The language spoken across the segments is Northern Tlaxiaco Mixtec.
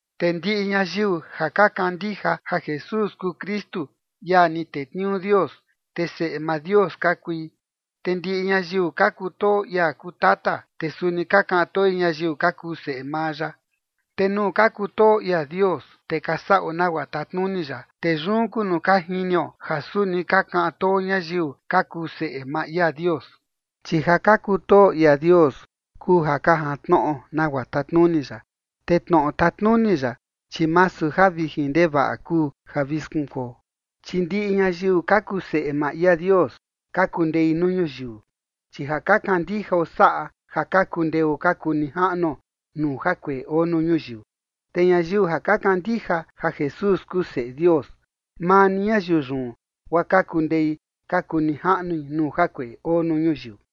Te ndiꞌi ñayiu ja ka kandija ja Jesús kuu Kristu, ia ni tetniuu Dios, te seꞌe maa Dios ka kui. Te ndiꞌi ñayiu ka kutoo ia kuu Tata, te suni ka kaꞌan toi ñayiu ka kuu seꞌe maa ya. Te nuu ka kutoo ia Dios, te ka saꞌo nagua tatnuni ya, te yun kuu nuu ka jinio ja suni ka kaꞌan too ñayiu ka kuu seꞌe maa ia Dios. Chi ja ka kutoo ia Dios kuu ja ka jantnoꞌo nagua tatnuni ya, te tnoꞌo tatnuni ya, chi masu ja vijin ndevaꞌa kuu ja vi skunkuo. Chi ndiꞌi ñayiu ka kuu seꞌe maa ia Dios ka kundei nuu ñuyiu. Chi ja ka kandijao saꞌa ja ka kundeo ka kuu nijaꞌnuo nuu jakueꞌe oo nuu ñuyiu. Te ñayiu ja ka kandija ja Jesús kuu Seꞌe Dios, maa ni ñayiu yun guaa ka kundei ka kuu nijaꞌnui nuu jakueꞌe oo nuu ñuyiu.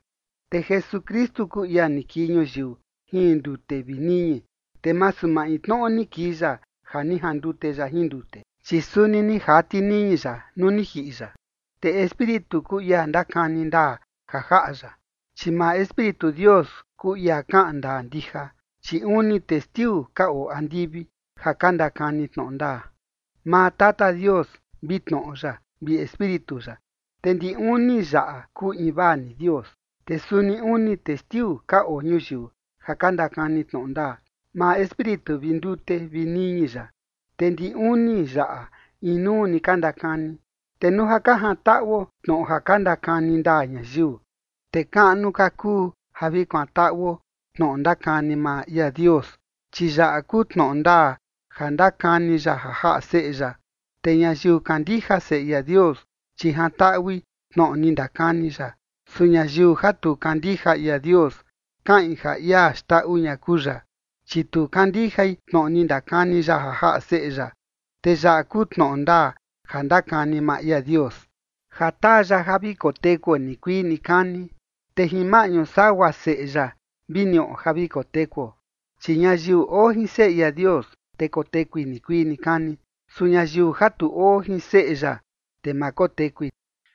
Te Jesukristu kuu ia ni kii ñuyiu jin ndute vi niñi, te masu maintnoꞌo ni kii ya ja ni jandute ya jin ndute, chi suni ni jati niñi ya nuu ni jiꞌi ya. Te Espíritu kuu ia ndakani ndaa ja jaꞌa ya, chi maa Espíritu Dios kuu ia kaꞌan ndaa ndija. Chi uni testiu ka oo andivi ja ka ndakani tnoꞌo ndaa: [maa Tata Dios, vi Tnoꞌo ya, vi Espíritu ya, te ndi uni yaꞌa kuu invaa ni Dios]. Te suni uni testiu ka oo ñuyiu ja ka ndakani tnoꞌo ndaa: maa Espíritu vi ndute vi niñi ya, te ndi uni yaꞌa inuu ni ka ndakani. Te nuu ja ka jantaꞌuo tnoꞌo ja ka ndakani ndaa ñayiu, te kaꞌnu ka kuu ja vi kuantaꞌuo tnoꞌo ndakani maa ia Dios, chi yaꞌa kuu tnoꞌo ndaa ja ndakani ya ja jaꞌa Seꞌe ya. Te ñayiu kandija Seꞌe ia Dios, chi jantaꞌui tnoꞌo ni ndakani ya, su ñayiu ja tu kandija ia Dios kaꞌin ja ia xndaꞌu ña kuu ya, chi tu kandijai tnoꞌo ni ndakani ya ja jaꞌa Seꞌe ya. Te yaꞌa kuu tnoꞌo ndaa ja ndakani maa ia Dios: ja taa ya ja vi kotekuo nikuii nikani, te jin maꞌñu sagua Seꞌe ya vi niꞌo ja vi kotekuo. Chi ñayiu oo jin Seꞌe ia Dios, te kotekui nikuii nikani, su ñayiu ja tu oo jin Seꞌe ya, te ma kotekui.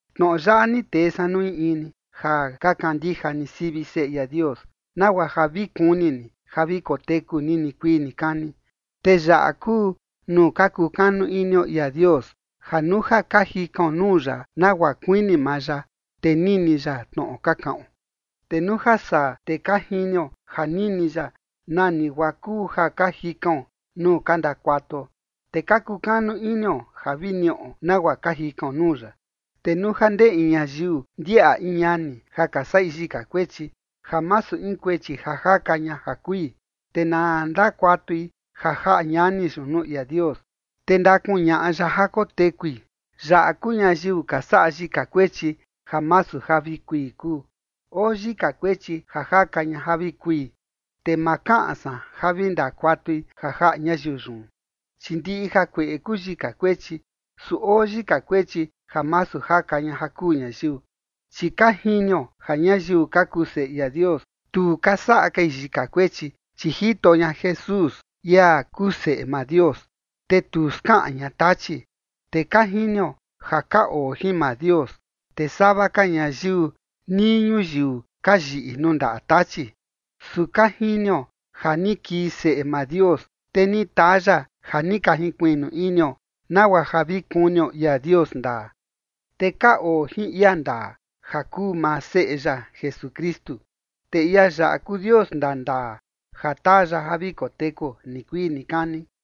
Tnoꞌo yaꞌa ni tee san nuu in in ni ja ka kandija ni sivi Seꞌe ia Dios, nagua ja vi kuni ni ja vi koteku ni nikuii nikani. Te yaꞌa kuu nuu ka kukanu inio ia Dios, ja nuu ja ka jikaon nuu ya nagua kuini maa ya, te nini ya tnoꞌo ka kaꞌon. Te nuu ja saa, te ka jinio ja nini ya nani guaa kuu ja ka jikaon nuu ka ndakuatuo, te ka kukanu inio ja vi niꞌo nagua ka jikaon nuu ya. Te nuu ja ndee in ñayiu ndiaꞌa in ñani ja ka saꞌi yika kuechi ja masu in kuechi ja jaka ña ja kui, te na ndakuatui ja jaꞌa ñani yun nuu ia Dios, te ndakuñaꞌa ya ja kotekui. Yaꞌa kuu ñayiu ka saꞌa yika kuechi ja masu ja vi kui kuu. Oo yika kuechi ja jaka ña ja vi kui, te ma kaꞌan san ja vi ndakuatui ja jaꞌa ñayiu yun. Chi ndiꞌi jakueꞌe kuu yika kuechi, su oo yika kuechi ja masu jaka ña ja kuu ñayiu. Chi ka jinio ja ñayiu ka kuu seꞌe ia Dios, tu ka saꞌa kai yika kuechi, chi jito ña Jesús, ia kuu Seꞌe maa Dios, te tu skaꞌan ña Tachi. Te ka jinio ja ka oo jin maa Dios, te sava ka ñayiu nii ñuyiu ka yiꞌi nuu ndaꞌa Tachi. Su ka jinio ja ni kii Seꞌe maa Dios, te ni taa ya ja ni ka jinkuiꞌnu inio, nagua ja vi kunio ia Dios ndaa. Te ka oo jin ia ndaa, ja kuu maa Seꞌe ya Jesukristu. Te ia yaꞌa kuu Dios ndandaa ja taa ya ja vi kotekuo nikuii nikani.